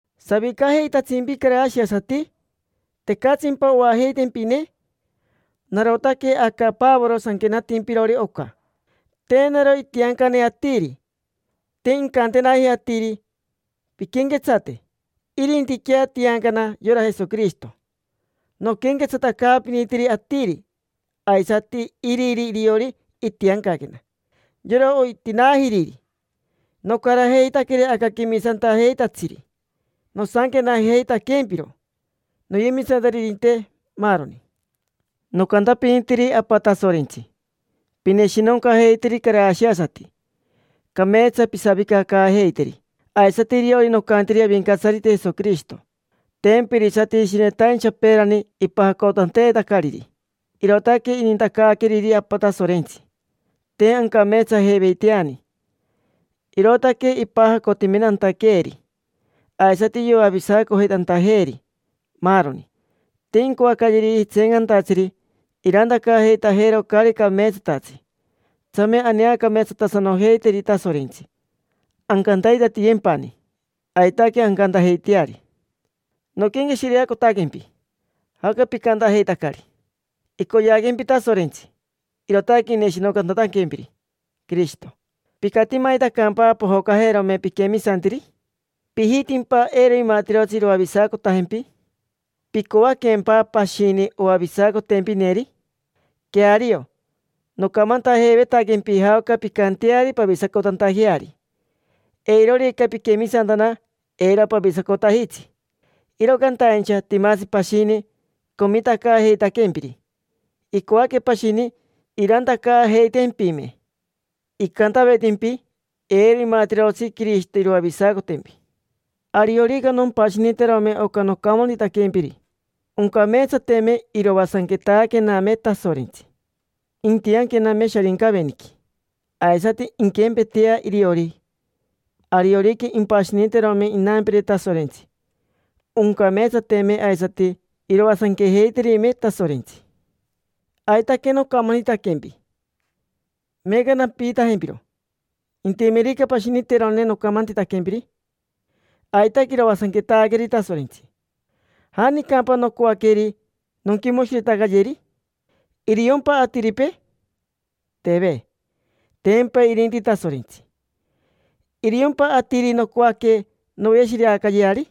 ¿Savicajeitatsimpi, carashiasati? ¿Tecatsimpa oajeitempine? Narotaque aca Pavoro sanquenatimpirori oca. Te naro itiancane atiri, te incantenaji atiri: “Pinquenquetsate”. Irintiquea tiancana yora Jesoquirishito noquenquetsatacaapinitiri atiri. Aisati iriri iriori itiancaquena: yora oitinaajiriri. Nocarajeitaqueri aca quemisantajeitatsiri, nosanquenajeitaquempiro noyemisantaririnte, maaroni. Nocantapinitiri Apa Tasorentsi: “Pineshinoncajeiteri carashiasati, cameetsa pisavicacaajeiteri”; aisati iriori nocantiri Avincatsarite Jesoquirishito. Tempa irisati shinetaincha peerani ipajacotanteetacariri, irootaque inintacaaqueriri Apa Tasorentsi. Te ancameetsajeiveiteani, irootaque ipajacotimentantaqueeri, aisati yoavisacojeitantajeeri, maaroni. Te incoacayeriji tseencantatsiri irantacaajeitajeero caari cameetsatatsi. Tsame aneacameetsatasanojeiteri Tasorentsi, ancantaitatiyempani. Aitaque ancantajeiteari. Noquenqueshireacotaquempi, jaoca picantajeitacari. Icoyeaquempi Tasorentsi, irootaque ineshinoncatantaquempiri Quirishito. ¿Picatimaitacampa pojocajerome piquemisantiri? ¿Pijitimpa eiro imatirotsi iroavisacotajempi? ¿Picoaquempa pashini oavisacotempineri? Queario nocamantajeivetaquempi jaoca pincanteari pavisacotantajeari. Eirorica piquemisantana, eiro pavisacotajitsi. Iro cantaincha timatsi pashini, comitacaajeitaquempiri. Icoaque pashini irantacaajeitempime, icantavetimpi: “Eiro imatirotsi Quirishito iroavisacotempi”. Ariorica nompashiniterome oca nocamantitaquempiri, oncameetsateme iroasanquetaquename Tasorentsi, intianquename Sharincaveniqui. Aisati inquempetea iriori, ariorica impashiniterome inampire Tasorentsi, oncameetsateme aisati iroasanquejeiterime Tasorentsi. Aitaque nocamantitaquempi, meeca nampiitajempiro: intimerica pashiniteroneri nocamantitaquempiri, aitaque iroasanquetaqueri Tasorentsi. ¿Janicampa nocoaqueri nonquimoshiretacayeri? ¿Iriompa atiripee? Teve, tempa irinti Tasorentsi. ¿Iriompa atiri nocoaque noveshireacayeari?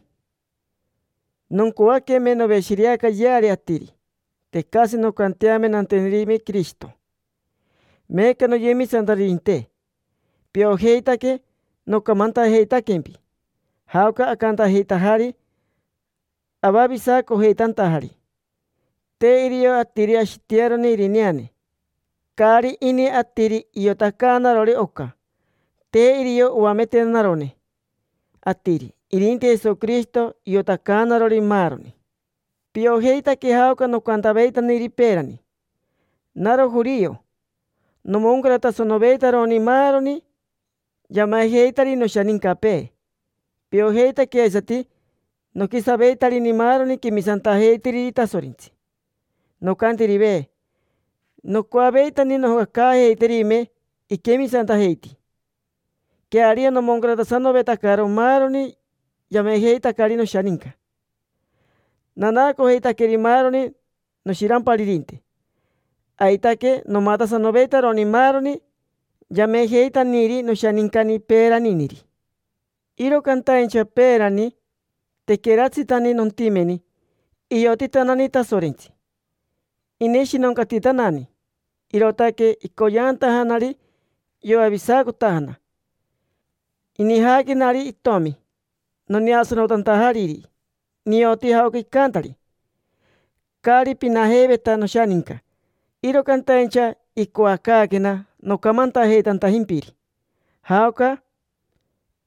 Noncoaqueme noveshireacayeari atiri, tecatsi noncanteame nantenerime Quirishito. Meeca, noyemisantaririnte, piojeitaque nocamantajeitaquempi jaoca acantajeitajari avavisacojeitantajari. Te irio atiri ashitearone irineane. Caari ini atiri iotacaanarori oca, te irio oametenarone atiri. Irinti Jesoquirishito iotacaanarori maaroni. Piojeitaque jaoca nocantaveitaniri peerani: naro jorio, nomoncaratasanoveitaroni maaroni yamejeitari noshanincapee. Piojeitaque aisati noquisaveitarini maaroni quemisantajeitiriri Tasorentsi. Nocantirive, nocoaveitani nojocacaajeiterime iquemisantajeiti. Queario, nomoncaratasanovetacaro maaroni yamejeitacari noshaninca: nanaacojeitaqueri maaroni noshiramparirinte. Aitaque, nomatasanoveitaroni maaroni yamejeitaniri noshanincani peeraniniri. Iro cantaincha peerani, tequeratsitani nontimeni, iotitanani Tasorentsi. Ineshinoncatitanani, irootaque icoyeantajanari yoavisacotajana. Inijaaquenari itomi, noneasanotantajariri: nioti jaoca icantari. Caari pinajeiveta noshaninca, iro cantaincha icoacaaquena nocamantajeitantajimpiri jaoca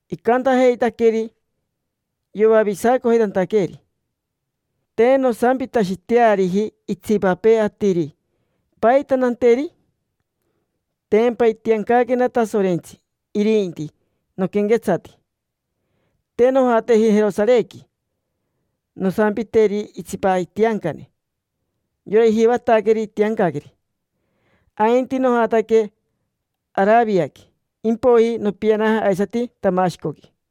icantajeitaqueeri yoavisacojeitantaqueeri. Te nosampitashiteariji itsipapee atiri: “¿Paita nanteri?” Tempa itiancaquena Tasorentsi irinti noquenquetsati. Te nojateji Jerosarequi nosampiteri itsipa itiancane: yora ijivataqueri itiancaqueri, ainti nojataque Araviaqui. Impoiji nopianaja aisati Tamashicoqui.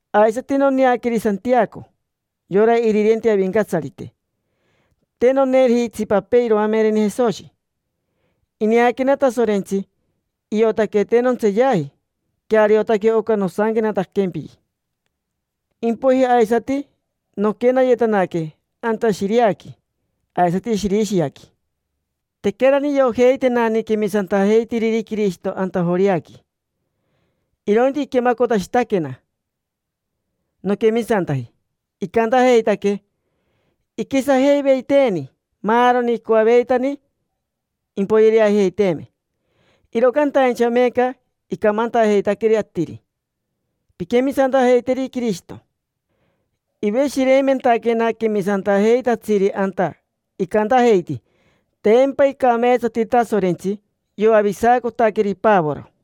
Aisati noneaqueri Santiaco, yora irirenti Avincatsarite. Te noneeriji itsipapee iroamereni Jesoshi. Ineaquena Tasorentsi, iotaque te nontseeyaji. Queariotaque oca nosanquenataquempiri. Impoiji aisati noquenayetanaque anta Shiriaqui aisati Shirishiaqui. Tequerani iriojeitenani quemisantajeitiriri Quirishito anta Joreaqui, irointi iquemacotashitaquena noquemisantaji. Icantajeitaque: “Iquisajeiveiteeni maaroni, icoaveitani impoyereajeiteeme, iro cantaincha meeca icamantajeitaqueri atiri: ‘Pinquemisantajeiteri Quirishito’”. Iveshireimentaquena quemisantajeitatsiri anta, icantajeiti: “Tempa icameetsati Tasorentsi, yoavisacotaqueri Pavoro”.